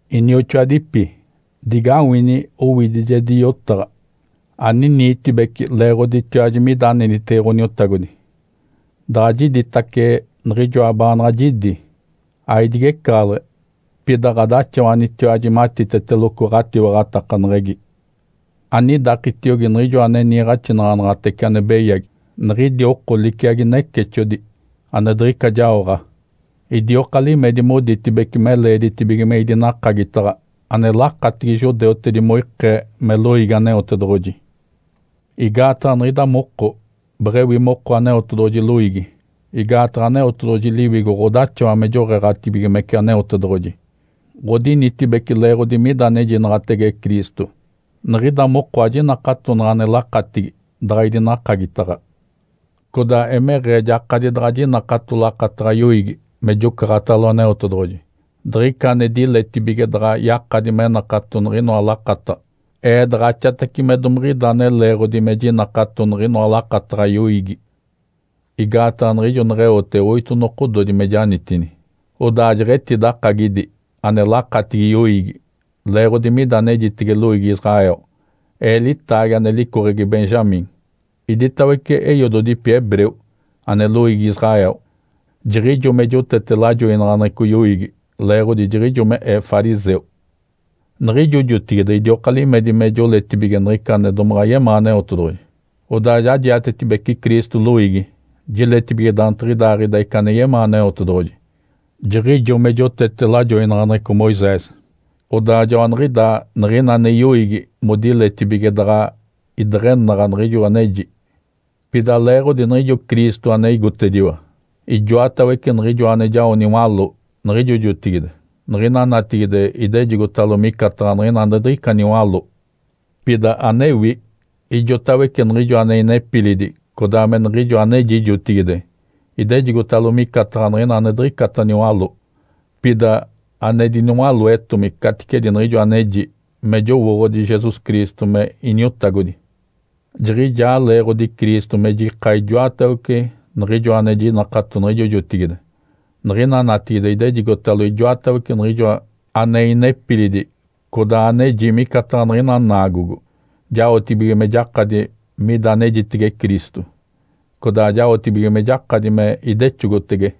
Inioxoadipi, digawini owidijedi yotaɡ̶a. Aniniitibeci leeɡ̶oditiwaji mida anenitege Ǥoniotagodi. Daɡ̶a jiditace niɡ̶ijoa baanaɡ̶a jidi, aidigecaɡ̶aleɡ̶e, pida ɡ̶adaxawanitiwaji matiteteloco ɡ̶atiwaɡ̶atakaneɡ̶egi. Anidakitiogi niɡ̶ijo ane niiɡ̶axinaɡ̶anaɡ̶atece ane beyagi, niɡ̶idi oko liciagi necexodi (ane diɡ̶ica jaoɡ̶a), idioka limedi moditibece me leeditibige me idinakagitaɡ̶a ane lakatigi judeutedi moikee me loiigi Aneotedoɡ̶oji. Igaataɡ̶a niɡ̶ida moko beɡ̶ewi moko Aneotedoɡ̶oji loiigi. Igaataɡ̶a Aneotedoɡ̶oji Liwigo ɡ̶odaxawa me joɡ̶eeɡ̶atibigimece Aneotedoɡ̶oji, ɡ̶odinitibece leeɡ̶odi mida anejinaɡ̶atege Cristo. Niɡ̶ida moko ajinakatonaɡ̶a ane lakatigi daɡ̶a idinakagitaɡ̶a. Codaa emeɡ̶ee jakadi daɡ̶a jinakato lakataɡ̶a yoiigi me jocaɡ̶atalo Aneotedoɡ̶oji. Diɡ̶ica ane diletibige daɡ̶a yakadi me nakato niɡ̶inoa lakataɡ̶a, ee daɡ̶axatace me domiɡ̶ida ane leeɡ̶odi me jinakato niɡ̶inoa lakataɡ̶a yoiigi. Igaataɡ̶a niɡ̶ijo neɡ̶eote oito nokododi me janitini, odaa jeɡ̶etidakagi ane lakatigi yoiigi, leeɡ̶odi mida anejitege loiigi Israel. Ee litaagi ane licoɡ̶egi Benjamim. Iditawece eiododipi hebreu (ane loiigi Israel). Jiɡ̶ijo me jotete lajoinaɡ̶aneɡ̶eco yoiigi leeɡ̶odi jiɡ̶ijo me ee fariseu. Niɡ̶ijo jotigide idioka limedi me joletibige niɡ̶ica ane domaɡ̶a yemaa Aneotedoɡ̶oji, odaa ja jiatetibece Cristo loiigi (jiletibige daantiɡ̶idaaɡ̶ida ica ane yemaa Aneotedoɡ̶oji). Jiɡ̶ijo me jotete lajoinaɡ̶aneɡ̶eco Moisés. Odaa joaniɡ̶idaa niɡ̶ina ane yoiigi modiletibige daɡ̶a ideɡ̶enaɡ̶a niɡ̶ijo aneji. Pida leeɡ̶odi niɡ̶ijo Cristo ane igotediwa, ijoatawece niɡ̶ijoa ane jao niwaló niɡ̶ijo jotigide, niɡ̶ina natigide idejigotalo micataɡ̶a niɡ̶ina ane diɡ̶ica niwaló. Pida anewi, ijotawece niɡ̶ijo ane inepilidi codaa me niɡ̶ijo aneji jotigide idejigotalo micataɡ̶a niɡ̶ina ane diɡ̶icata niwaló. Pida ane diniwaloetomi caticedi niɡ̶ijo aneji, me jowooɡ̶odi Jesus Cristo me Iniotagodi. Jiɡ̶ijaa leeɡ̶odi Cristo me jika ijoatawece niɡ̶ijoa ane jinakato niɡ̶ijo jotigide, niɡ̶ina natigide idejigotalo ijoatawece niɡ̶ijoa ane inepilidi codaa aneji micataɡ̶a niɡ̶ina naagogo, jaotibige me jakadi mida anejitege Cristo, codaa jaotibige me jakadi me idexogotege.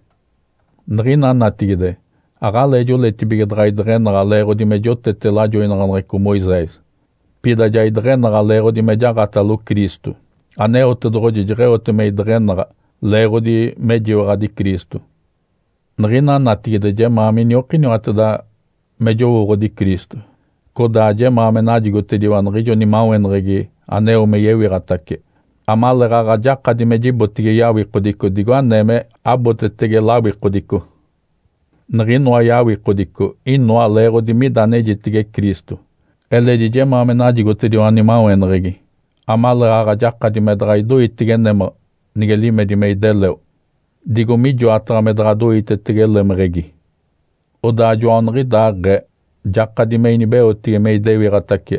Niɡ̶ina natigide aɡ̶alee joletibige daɡ̶a ideɡ̶enaɡ̶a leeɡ̶odi me jotete lajoinaɡ̶aneɡ̶eco Moisés. Pida ja ideɡ̶enaɡ̶a leeɡ̶odi me jaɡ̶atalo Cristo. Aneotedoɡ̶oji jeɡ̶eote me ideɡ̶enaɡ̶a, leeɡ̶odi mejiwaɡ̶adi Cristo. Niɡ̶ina natigide jemaa miniokiniwateda me jowooɡ̶odi Cristo, codaa jemaa me najigotediwa niɡ̶ijo nimaweneɡ̶egi aneo me yewiɡ̶atace, amaleeɡ̶aɡ̶a jakadi me jibotege yawikodico digo anee me abotetege lawikodico. Niɡ̶inoa yawikodico inoa leeɡ̶odi mida anejitege Cristo. Eledi jemaa me najigotediwa nimaweneɡ̶egi amaleeɡ̶aɡ̶a jakadi me daɡ̶a idoitege némaɡ̶a nige limedi me ideleo, digo mijoataɡ̶a me daɡ̶a doitetege lemeɡ̶egi. Odaa joaniɡ̶idaaɡ̶ee jakadi me inibeotege me idewiɡ̶atace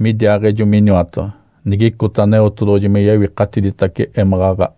midiaaɡ̶ejo miniwataɡ̶a, nigicota Aneotedoɡ̶oji me yewikatiditace émaɡ̶aɡ̶a.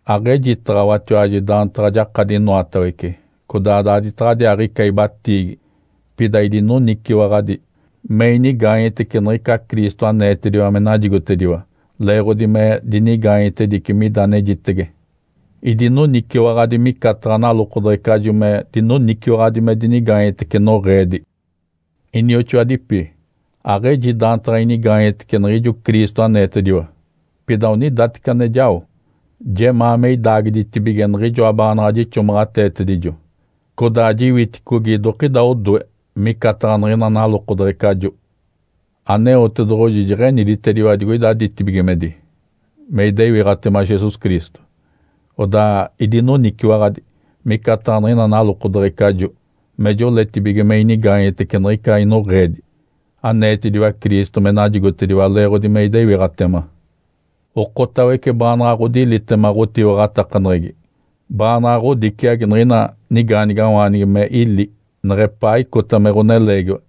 Aɡ̶ejitaɡ̶awatiwaji daantaɡ̶a jakadi inoatawece, codaa daaditaɡ̶adiaaɡ̶ica ibatiigi. Pida idinoniciwaɡ̶adi me inigaanyetece niɡ̶ica Cristo aneetediwa me najigotediwa leeɡ̶odi me dinigaanyetedici mida anejitege. (Idinoniciwaɡ̶adi micataɡ̶a nalokodeɡ̶ecajo me dinoniciwaɡ̶adi me dinigaanyetece noɡ̶eedi.) Inioxoadipi, aɡ̶eji daantaɡ̶a inigaanyetece niɡ̶ijo Cristo aneetediwa. Pida onidateci ane jao, jemaa me idaagiditibige niɡ̶ijoa baanaɡ̶a jixomaɡ̶ateetedijo, codaa jiwiticogi idokida odoe. (Micataɡ̶a niɡ̶ina nalokodeɡ̶ecajo.) Aneotedoɡ̶oji jeɡ̶eniditediwa digoida ditibigimedi me idewiɡ̶atema Jesus Cristo, odaa idinoniciwaɡ̶adi (micataɡ̶a niɡ̶ina nalokodeɡ̶ecajo) me joletibige me inigaanyetece niɡ̶ica inoɡ̶eedi, aneetediwa Cristo me najigotediwa leeɡ̶odi me idewiɡ̶atema. Okotawece baanaɡ̶a ɡ̶odilitema ɡ̶otiwaɡ̶atakaneɡ̶egi, baanaɡ̶a ɡ̶odiciagi niɡ̶ina nigaanigawaanigi me ili nigepaa icota me ɡ̶oneleegiwa,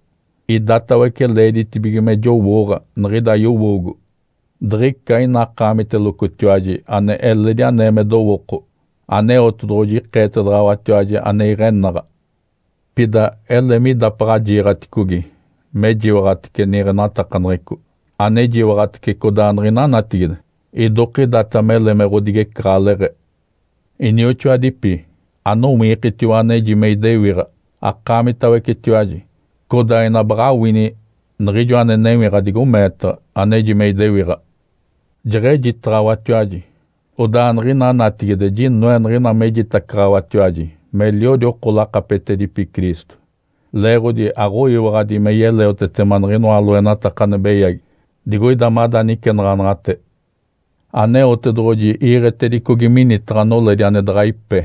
idatawece leeditibige me jowooɡ̶a niɡ̶ida yowoogo. Diɡ̶ica ina akaamitelocotiwaji ane eledi anee me dowooko, Aneotedoɡ̶oji ikeetedaɡ̶awatiwaji ane iɡ̶enaɡ̶a. Pida ele me idapaɡ̶a jiiɡ̶aticogi mejiwaɡ̶atece niiɡ̶enatakaneɡ̶eco, anejiwaɡ̶atece codaa niɡ̶ina natigide, idokidata mele me ɡ̶odigecaɡ̶aleɡ̶e. Inioxoadipi, anowiikitiwa aneji me idewiɡ̶a akaamitawecetiwaji, codaa ina baɡ̶a awini niɡ̶ijo ane newiɡ̶a digo meetaɡ̶a aneji me idewiɡ̶a. Jeɡ̶ejitaɡ̶awatiwaji, odaa niɡ̶ina natigide jinoe niɡ̶ina mejitacaɡ̶awatiwaji meliodi oko lakapetedipi Cristo, leeɡ̶odi aɡ̶oyiwaɡ̶adi me yeleotetema niɡ̶inoa loenataka ane beyagi digoida mada nicenaɡ̶anaɡ̶ate. Aneotedoɡ̶oji iiɡ̶etedicogi minitaɡ̶a noledi ane daɡ̶a ipe.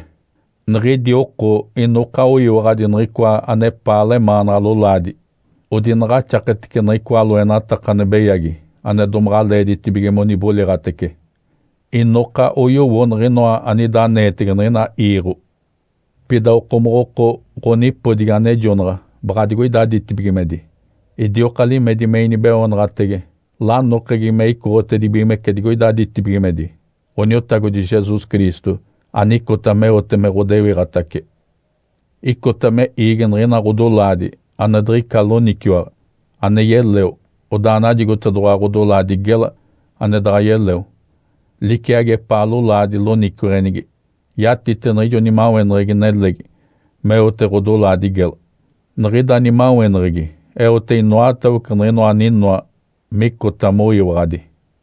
Niɡ̶idi oko inoka oyiwaɡ̶adi niɡ̶icoa anepaa lemaanaɡ̶a lolaadi. Odinaɡ̶axaketece niɡ̶icoa loenataka ane beyagi ane domaɡ̶a leeditibige moniboliɡ̶atece. Inoka oyowo niɡ̶inoa anida aneetege niɡ̶ina iiɡ̶o. Pida okomoɡ̶oko ɡ̶onipodigi anejonaɡ̶a baɡ̶a digoida ditibigimedi. Idioka limedi me inibeoonaɡ̶atege lanokegi me icoɡ̶otedibigimece digoida ditibigimedi, Ǥoniotagodi Jesus Cristo anicota meote me ɡ̶odewiɡ̶atace. Icota me iigi niɡ̶ina ɡ̶odolaadi ane diɡ̶ica loniciwaɡ̶a, ane yeleo, odaa najigotedoɡ̶owa ɡ̶odolaadi gela ane daɡ̶a yeleo, liciagi epaa lolaadi loniciweɡ̶enigi. Yatite niɡ̶ijo nimaweneɡ̶egi nelegi meote ɡ̶odolaadi gela. Niɡ̶ida nimaweneɡ̶egi eote inoatawece niɡ̶inoa aninoa micota moyiwaɡ̶adi.